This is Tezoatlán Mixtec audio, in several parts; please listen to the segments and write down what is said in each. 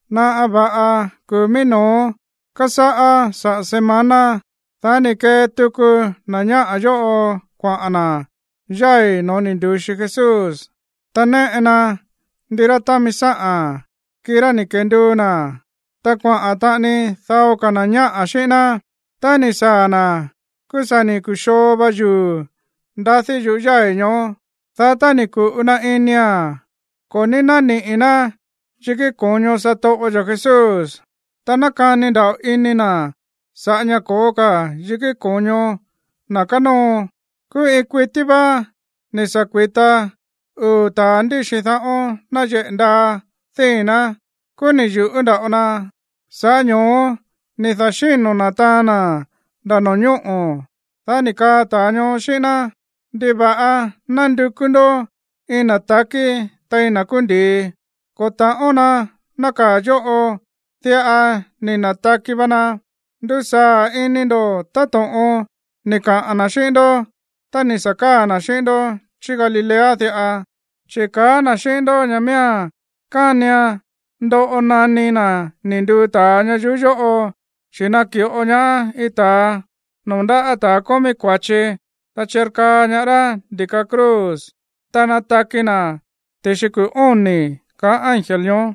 Naꞌa va̱ꞌa kuu̱ mií no̱ó kásáꞌá saꞌa̱ semana, dá ni̱ kee tuku na̱ ñáꞌa̱ yóꞌo kuaꞌa̱n na̱ yái̱ no̱ó ni̱ ndu̱xi Jesús, ta néꞌe na ndirá támi sáꞌa̱n, kirá ni̱ kenduu na̱, ta kuaꞌa̱n taꞌani dao ka̱ na̱ ñáꞌa̱ xíꞌín ná. Tá ni̱ saa̱ na̱, kúú sa̱ ni̱ ku̱xoo va yuu̱ ndadí yuꞌú yái̱ ñoó. Dá tá ni̱ ku̱ꞌu na inia̱n, ko̱ ní nániꞌi̱ ná yikí ko̱ño satoꞌo yo̱ Jesús. Ta nákani nda̱ꞌo ini na̱ sa̱ꞌá ña̱ ko̱ó ka̱ yikí ko̱ño na̱ kánóo. Kúú iin kuití vá ni̱ sa̱ kui̱ta uu̱ ta̱a ndíxi dáꞌo̱n náyeꞌe̱ ndaa díi̱n ná. Kúú ni̱ yu̱ꞌú nda̱ꞌo na, sa̱ꞌá ño̱ó ni̱ da̱xíno̱ na̱ taan na̱ nda̱ no̱ñóꞌo̱. Dá ni̱ kaa ta̱a ñoó xíꞌín ná: ―¿Ndiva̱ꞌa nándukú ndó iin na̱ takí tein na̱ kúú ndi̱i? Ko̱ ta̱ꞌón na nákaa̱ yóꞌo. Diꞌa ni̱ na̱taki va na. Ndusaa̱ ini ndo̱ táto̱ꞌon ni̱ kaꞌa̱n na̱ xíꞌín ndó tá ni̱ sa̱ káa̱ na̱ xíꞌín ndó chí Galilea diꞌa. Chi̱ ni̱ kaa na̱ xíꞌín ndó ña̱ miía̱n kánian ndoꞌo naní na̱ ni̱ nduu ta̱a ñayuú yóꞌo, chi̱ naki̱ꞌo ñaá iin ta̱a noo̱ ndáꞌa̱ ta̱a kómí kua̱chi, ta chirkaa ñaá rá ndi̱ka cruz, ta nataki na̱ ti̱xi kuu̱ óni̱ ―kaá ángel ñoó.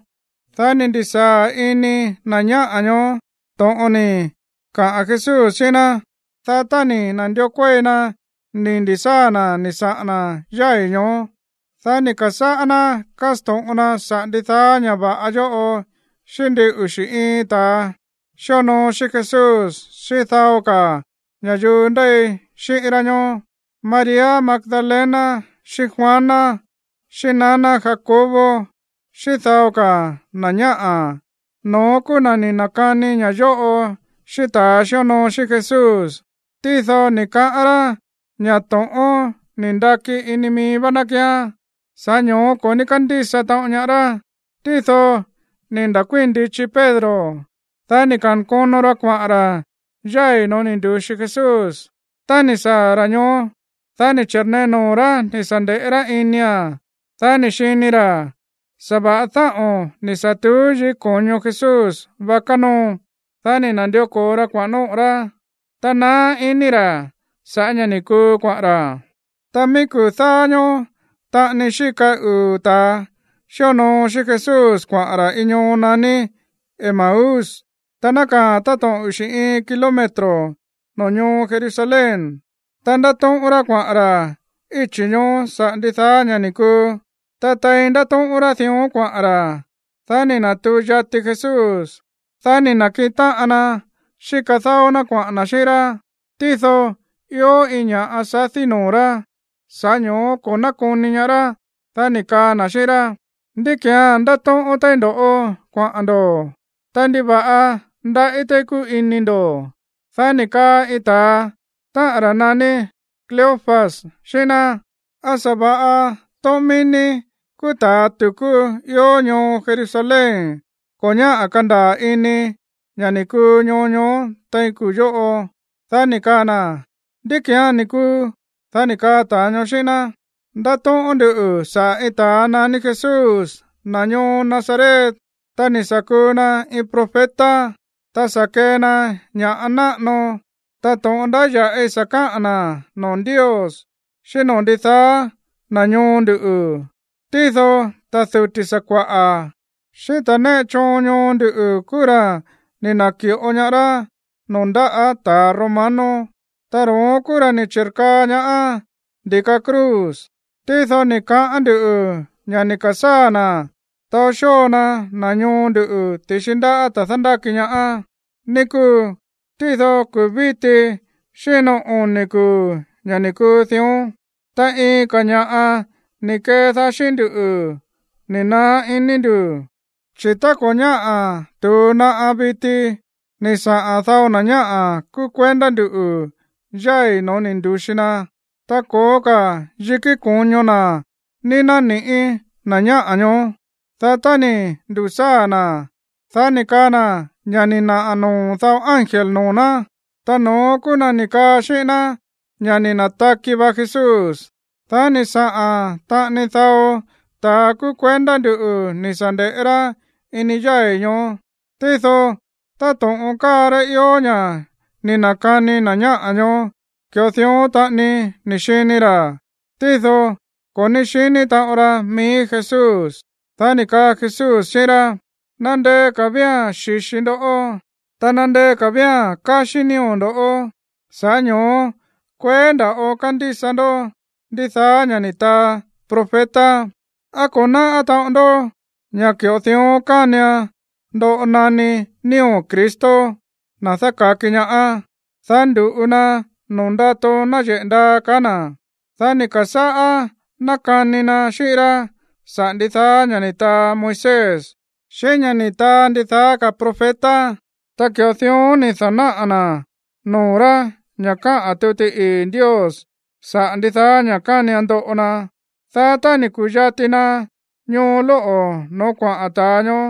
Dá ni̱ ndi̱sáa̱ ini na̱ ñáꞌa̱ ñoó to̱ꞌon ni̱ kaꞌa̱n Jesús xíꞌín ná. Dá tá ni̱ na̱ndió kuéi na ni̱ ndi̱sáa̱ na̱ ni̱ saꞌa̱n na̱ yái̱ ñoó, dá ni̱ ka̱sáꞌá ná kásto̱ꞌon na saꞌa̱ ndidaá ña̱ va̱ꞌa yóꞌo xíꞌín ndin uxi̱ iin ta̱a xíonoo xíꞌín Jesús xíꞌín dao ka̱ ña̱yuu ndéi xíꞌín rá ñoó. María Magdalena xíꞌín Juana, xíꞌín naná Jacobo xíꞌín dao ka̱ na̱ ñáꞌa̱, no̱ón kúú na̱ ni̱ na̱kani ña̱ yóꞌo xíꞌín ta̱a xíonoo xíꞌín Jesús. Tído ni̱ kaꞌán rá ña̱ to̱ꞌón ni̱ ndaki ini mií vá ná kíán, sa̱ꞌá ño̱ó ko̱ ní kándísa taꞌon ñaá rá. Tído ni̱ nda̱kuíi̱n ndichi Pedro, dá ni̱ ka̱nkono ra kuaꞌa̱n ra̱ yái̱ no̱ó ni̱ ndu̱xi Jesús. Tá ni̱ saa̱ ra̱ ñoó, dá ni̱ chi̱rnee noo̱ rá ni̱ sa̱ nde̱ꞌé rá inia̱n. Dá ni̱ xini ra̱ sa̱va̱ꞌa dáꞌo̱n ni̱ sa̱ tuú yikí ko̱ño Jesús vá kánóo. Dá ni̱ na̱ndió ko̱o ra kuaꞌa̱n nóꞌo̱ rá, ta naá iní ra̱ sa̱ꞌá ña̱ ni̱ kuu kuaꞌa̱n ra̱. Ta mií kuu̱ dáá ñóó taꞌani xíka uu̱ ta̱a xíonoo xíꞌín Jesús kuaꞌa̱n ra̱ iin ñoo naní Emaús. Ta nákaa̱a̱n táto̱ꞌon uxi̱ iin kilómetro noo̱ ñoo Jerusalén. Ta ndátóꞌón rá kuaꞌa̱n ra̱ íchi̱ ñoó saꞌa̱ ndidaá ña̱ ni̱ kuu. Ta tein ndátóꞌón rá dión kuaꞌa̱n ra̱, dá ni̱ na̱tuu yati Jesús, dá ni̱ na̱kiꞌin táꞌan na xíka dáó ná kuaꞌa̱n na̱ xíꞌín rá. Tído ió iin ña̱ꞌa sadí noo̱ rá, sa̱ꞌá ño̱ó ko̱ nákoni ñaá rá. Dá ni̱ kaa na̱ xíꞌín rá: ―¿Ndí ki̱án ndátóꞌón téí ndo̱ kuaꞌa̱n ndo̱? Ta, ¿ndiva̱ꞌa ndaꞌí téí kúu ini ndo̱? Dá ni̱ kaa iin ta̱a, táꞌa̱n ra̱ naní Cleofas, xíꞌín ná: ―¿Á sa̱va̱ꞌa iin tóꞌón mií ní kúú ta̱ tu̱kú ió ñoo Jerusalén ko̱ ñáꞌa̱ kandaa̱ ini ña̱ ni̱ kuu ñoo ñoó tein kuu̱ yóꞌo? Dá ni̱ kaa na̱: ―¿Ndí ki̱án ni̱ kuu? Dá ni̱ kaa ta̱a ñoo xíꞌín ná: ―Ndátóꞌón ndú saꞌa̱ iin ta̱a naní Jesús, na̱ ñoo Nazaret. Ta ni̱ sa̱ kuu na iin profeta. Ta sa̱ kee na ña̱ꞌa náꞌano, ta to̱ꞌon ndáya̱ꞌi sa̱ káꞌa̱n na̱ noo̱ Ndios xíꞌín noo̱ ndidaá na̱ ñoo ndu̱. Tído ta̱ duti̱ sakua̱ꞌa̱, xíꞌín ta̱ néꞌe choon ñoo ndu̱ kúú ra̱ ni̱ na̱ki̱ꞌo ñaá rá noo̱ ndáꞌa̱ ta̱ romano. Ta ro̱ón ni̱ chi̱rkaa ñaá ndi̱ka cruz. Tído ni̱ kaꞌán nduꞌu̱ ña̱ ni̱ ka̱sáa̱ na̱ taó xóo na na̱ ñoo ndu̱ ti̱xi ndaꞌá ta̱ dándáki ñaá, ní kúu. Ta kuu̱ víti xíno oni̱ kuu̱ ña̱ ni̱ kuu dión. Ta iin ka̱ ña̱ꞌa ni̱ kedaá xíꞌín ndú ni̱ naá ini ndu̱, chi̱ tá ko̱ ñáꞌa̱ tu̱u naꞌa viti ni̱ saꞌa̱n dao na̱ ñáꞌa̱ kúú kuendá nduꞌu̱ yái̱ no̱ó ni̱ ndu̱xi na, ta ko̱ó ka̱ yikí ko̱ño na̱ ní nániꞌi̱ na̱ ñáꞌa̱ ñoó. Dá tá ni̱ ndu̱sáa̱ na̱, dá ni̱ kaa na̱ ña̱ ni̱ naꞌa̱ noo̱ dao ángel noo̱ ná, ta no̱ón kúú na̱ ni̱ kaa xíꞌín ná ña̱ ni̱ na̱taki va Jesús. Dá ni̱ saꞌa̱n taꞌani dao ta̱a kúú kuendá nduꞌu̱ ni̱ sa̱ nde̱ꞌé rá ini yái̱ ñoó. Tído táto̱ꞌon káa rá ió ña̱ ni̱ na̱kani na̱ ñáꞌa̱ ñoó, ki̱ꞌo dión taꞌani ni̱ xini ra̱. Tído ko̱ ní xiní taꞌon ra mií Jesús. Dá ni̱ kaa Jesús xíꞌín rá: ―¡Nandeé ka̱ vía̱n xíxi ndoꞌó, ta nandeé ka̱ vía̱n káxí nío̱ ndo̱, sa̱ꞌá ño̱ó kueé nda̱ꞌo kándísa ndó ndidaá ña̱ ni̱ taa profeta! ¿Á ko̱ náꞌá taꞌon ndó ña̱ ki̱ꞌo dión kánian ndoꞌo naní nío̱ Cristo, na̱ dáka̱ki ñaá, dá ndu̱ꞌu na noo̱ ndato náyeꞌe̱ ndaa? ―kaá na̱. Dá ni̱ ka̱sáꞌá nákani na xíꞌín rá saꞌa̱ ndidaá ña̱ ni̱ taa Moisés, xíꞌín ña̱ ni̱ taa ndidaá ka̱ profeta. Ta ki̱ꞌo dión ni̱ da̱náꞌa̱ na̱ noo̱ rá ña̱ káꞌa̱n tuti ii̱ Ndios saꞌa̱ ndidaá ña̱ kánian ndoꞌo na. Dá tá ni̱ ku̱yati na ñoo lóꞌo̱ no̱ó kuaꞌa̱n ta̱a ñoó,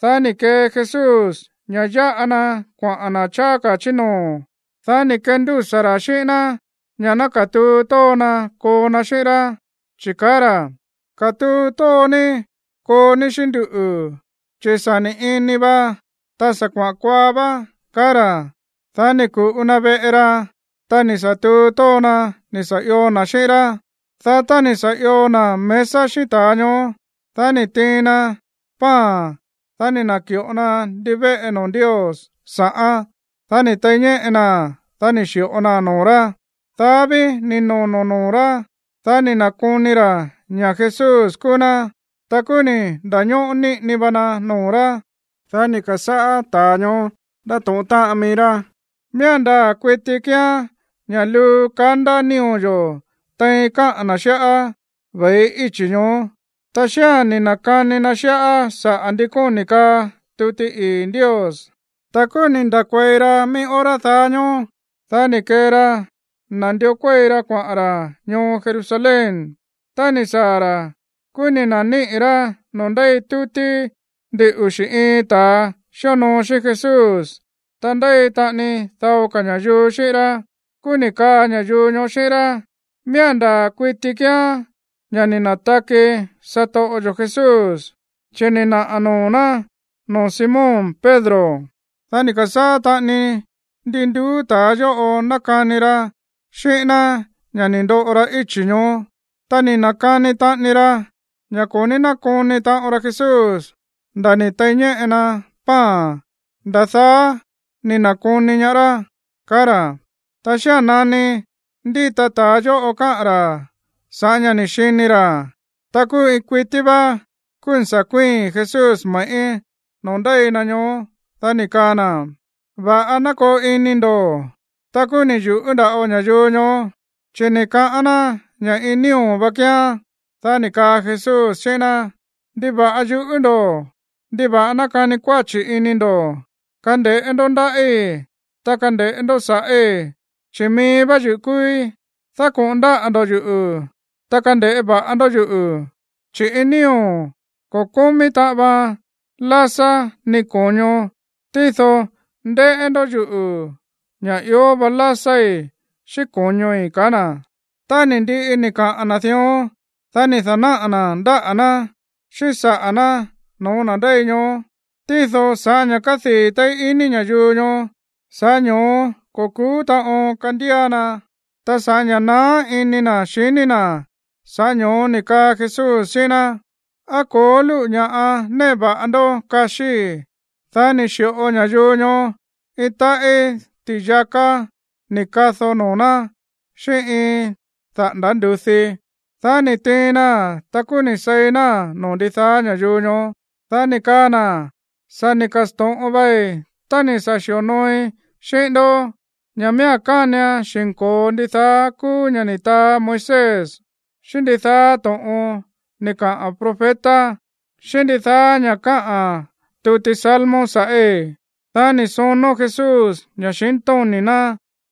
dá ni̱ kee Jesús ña̱ yáꞌa na kuaꞌa̱n na̱ cháá ka̱ chí noo̱. Dá ni̱ kendúsa̱ ra̱ xíꞌín ná ña̱ ná katuu tóo na koo na xíꞌín rá, chi̱ kaá ra̱: ―Katuu tóo ní koo ní xíꞌín nduꞌu̱, chi̱ sa̱ ni̱ ini va, ta sa̱ kuaꞌa̱n kuaa vá ―kaá ra̱. Dá ni̱ ku̱ꞌu na veꞌe ra, ta ni̱ sa̱ tuu tóo na ni̱ sa̱ io na̱ xíꞌín rá. Dá tá ni̱ sa̱ io na̱ mesa xíꞌín ta̱a ñoó, dá ni̱ tiin na pan. Dá ni̱ na̱ki̱ꞌo na ndivéꞌe noo̱ Ndios sa̱ꞌán. Dá ni̱ tei ñéꞌe naa̱n. Dá ni̱ xi̱ꞌo naa̱n noo̱ rá. Dá ví ni̱ nono̱ noo̱ rá, dá ni̱ na̱koni ra̱ ña̱ Jesús kúú ná. Ta kúú ni̱ nda̱ñóꞌó níꞌini va na noo̱ rá. Dá ni̱ ka̱sáꞌá ta̱a ñoó ndátóꞌón táꞌan mií rá: ―Miía̱n ndaa̱ kuiti kíán ña̱ luu kandá nío̱ yo̱ tein káꞌa̱n na̱ xíꞌá ve̱i íchi̱ ñoó, ta xía̱n ni̱ na̱kani na xíꞌá saꞌa̱ ndi kóni̱ káꞌa̱n tuti ii̱ Ndios. Ta kúú ni̱ nda̱kuei ra mií hora daá ñóó. Dá ni̱ kee ra nandió kuéi ra kuaꞌa̱n ra̱ ñoo Jerusalén. Tá ni̱ saa̱ ra̱, kúú ni̱ na̱níꞌi̱ rá noo̱ ndéi tútí ndin uxi̱ iin ta̱a xíonoo xíꞌín Jesús, ta ndéi taꞌani dao ka̱ ña̱yuu xíꞌín rá. Kúú ni̱ kaa ña̱yuu ñoó xíꞌín rá: ―Miía̱n ndaa̱ kuiti kíán ña̱ ni̱ na̱taki satoꞌo yo̱ Jesús, chi̱ ni̱ naꞌa̱ noo̱ ná noo̱ Simón Pedro. Dá ni̱ ka̱sáꞌá taꞌani ndi nduú ta̱a yóꞌo nákani ra xíꞌín ná ña̱ ni̱ ndoꞌo ra íchi̱ ñoó. Ta ni̱ na̱kani taꞌani ra ña̱ ko̱ ní nákoni taꞌon ra Jesús nda̱ ni̱ tei ñéꞌe na pan, nda̱ daá ni̱ na̱koni ñaá rá, kaá ra̱. Ta xía̱n nani ndíta ta̱a yóꞌo káꞌa̱n ra̱ sa̱ꞌá ña̱ ni̱ xini ra̱, ta kúú iin kuití vá, kúú ni̱ sa̱ kuíi̱n Jesús me̱ꞌí noo̱ ndéi na ñoó. Dá ni̱ kaa na̱: ―Va̱ꞌa ná koo ini ndo̱. Ta kúú ni̱ yu̱ꞌú nda̱ꞌo ña̱yuu ñoó, chi̱ ni̱ kaꞌán ná ña̱ iin nío̱ vá kíán. Dá ni̱ kaa Jesús xíꞌín ná: ―¿Ndiva̱ꞌa yuꞌú ndo̱? ¿Ndiva̱ꞌa nákani kuáchi̱ ini ndo̱? Kande̱ꞌé ndó ndáꞌí, ta kande̱ꞌé ndó sa̱ꞌí, chi̱ mií vá yuꞌu̱ kúúí. Dákoꞌo̱n ndáꞌa̱ ndo̱ yuꞌu̱, ta kande̱ꞌé va̱ꞌa ndó yuꞌu̱, chi̱ iin nío̱ ko̱ kómí taꞌan vaan lásá ni ko̱ño. Tído ndéꞌé ndó yuꞌu̱ ña̱ ió va lásái̱ xíꞌín ko̱ñoi̱ ―kaá na̱. Tá ni̱ ndiꞌi ni̱ kaꞌa̱n na̱ dión, dá ni̱ da̱náꞌa̱ na̱ ndáꞌa̱ ná xíꞌín saꞌa̱ ná no̱ó na̱ ndéi ñoó. Tído sa̱ꞌá ña̱ kádii̱ téí ini ña̱yuu ñoó, sa̱ꞌá ño̱ó ko̱ ku̱ú taꞌon kandía na. Ta sa̱ꞌá ña̱ naá ini na̱ xiní na̱, sa̱ꞌá ño̱ó ni̱ kaa Jesús xíꞌín ná: ―¿Á ko̱ó lúꞌu̱ ña̱ꞌa néꞌe va̱ꞌa ndó kaxíi̱? Dá ni̱ xi̱ꞌo ña̱yuu ñoó iin táꞌí ti̱yaká ni̱ kado noo̱ ná xíꞌín iin daꞌa̱nda̱ ndu̱dí. Dá ni̱ tiin naa̱n, ta kúú ni̱ seí náa̱n noo̱ ndidaá ña̱yuu ñoó. Dá ni̱ kaa na̱: ―Sa̱ ni̱ ka̱sto̱ꞌon vai tá ni̱ sa̱ xi̱onooi xíꞌín ndó ña̱ miía̱n kánian xi̱nko̱o ndidaá kúú ña̱ ni̱ taa Moisés, xíꞌín ndidaá to̱ꞌon ni̱ kaꞌa̱n profeta, xíꞌín ndidaá ña̱ káꞌa̱n tuti Salmo sa̱ꞌí. Dá ni̱ sonó Jesús ña̱xintóni̱ ná,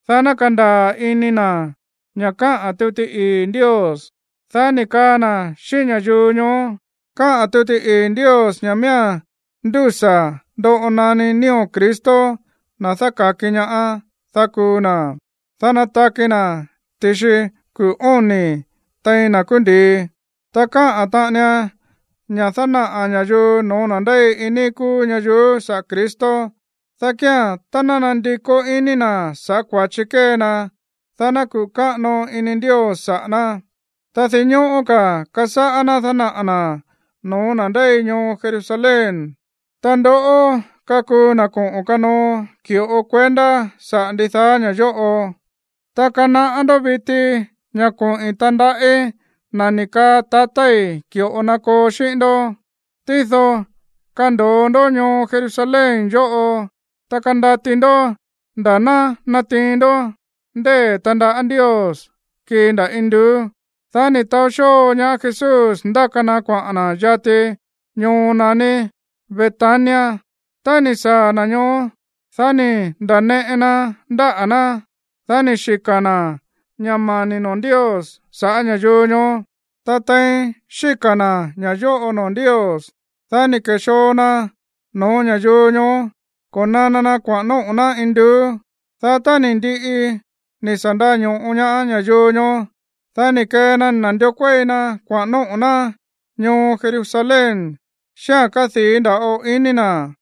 dá ná kandaa̱ ini na̱ ña̱ káꞌa̱n tuti ii̱ Ndios. Dá ni̱ kaa na̱ xíꞌín ña̱yuu ñoó: ―Káꞌa̱n tuti ii̱ Ndios ña̱ miía̱n ndúsa̱ ndoꞌo naní nío̱ Cristo, na̱ dáka̱ki ñaá, dá kuu na̱, dá nataki na̱ ti̱xi kuu̱ óni̱ tein na̱ kúú ndi̱i. Ta káꞌa̱n taꞌanian ña̱ dánaꞌa̱ ña̱yuu no̱ó na̱ ndéi iin níí kúú ñayuú saꞌa̱ Cristo, dá kía̱n, tá ná nandikó iní na̱ sa̱ꞌá kua̱chi kée na, dá ná kuꞌu̱ káꞌano ini Ndios saꞌa̱ ná. Ta dinñóꞌó ka̱ kasáꞌá ná dánaꞌa̱ na̱ no̱ó na̱ ndéi ñoo Jerusalén. Ta ndoꞌó kakuu na̱ koꞌo̱n kanoo ki̱ꞌo kuendá saꞌa̱ ndidaá ña̱ yóꞌo. Ta kanaꞌá ndó viti ña̱ koꞌi̱n tandaꞌí na̱ ni̱ kaa tatái̱ ki̱ꞌo na koo xíꞌín ndó. Tído kando̱o ndó ñoo Jerusalén yóꞌo, ta kandati ndó nda̱ ná natiin ndó ndée̱ tandaꞌá Ndios kii nda̱ induú. Dá ni̱ taó xóo ñaá Jesús ndáka na kuaꞌa̱n na̱ yati ñoo naní Betania. Tá ni̱ saa̱ na̱ ñoó, dá ni̱ nda̱neꞌe na ndáꞌa̱ ná. Dá ni̱ xika̱ na̱ ña̱ mani̱ noo̱ Ndios sa̱ꞌá ña̱yuu ñoó. Ta tein xíka̱ na̱ ña̱ yóꞌo noo̱ Ndios, dá ni̱ ke̱xoo na no̱ó ña̱yuu ñoó ko̱nana na kuaꞌa̱n nóꞌo̱ ná induú. Dá tá ni̱ ndiꞌi ni̱ sa̱ ndaño̱ꞌo ñaá ña̱yuu ñoó, dá ni̱ kee na nándió kuéi na kuaꞌa̱n nóꞌo̱ ná ñoo Jerusalén xíꞌa̱n kádii̱ nda̱ꞌo ini na̱.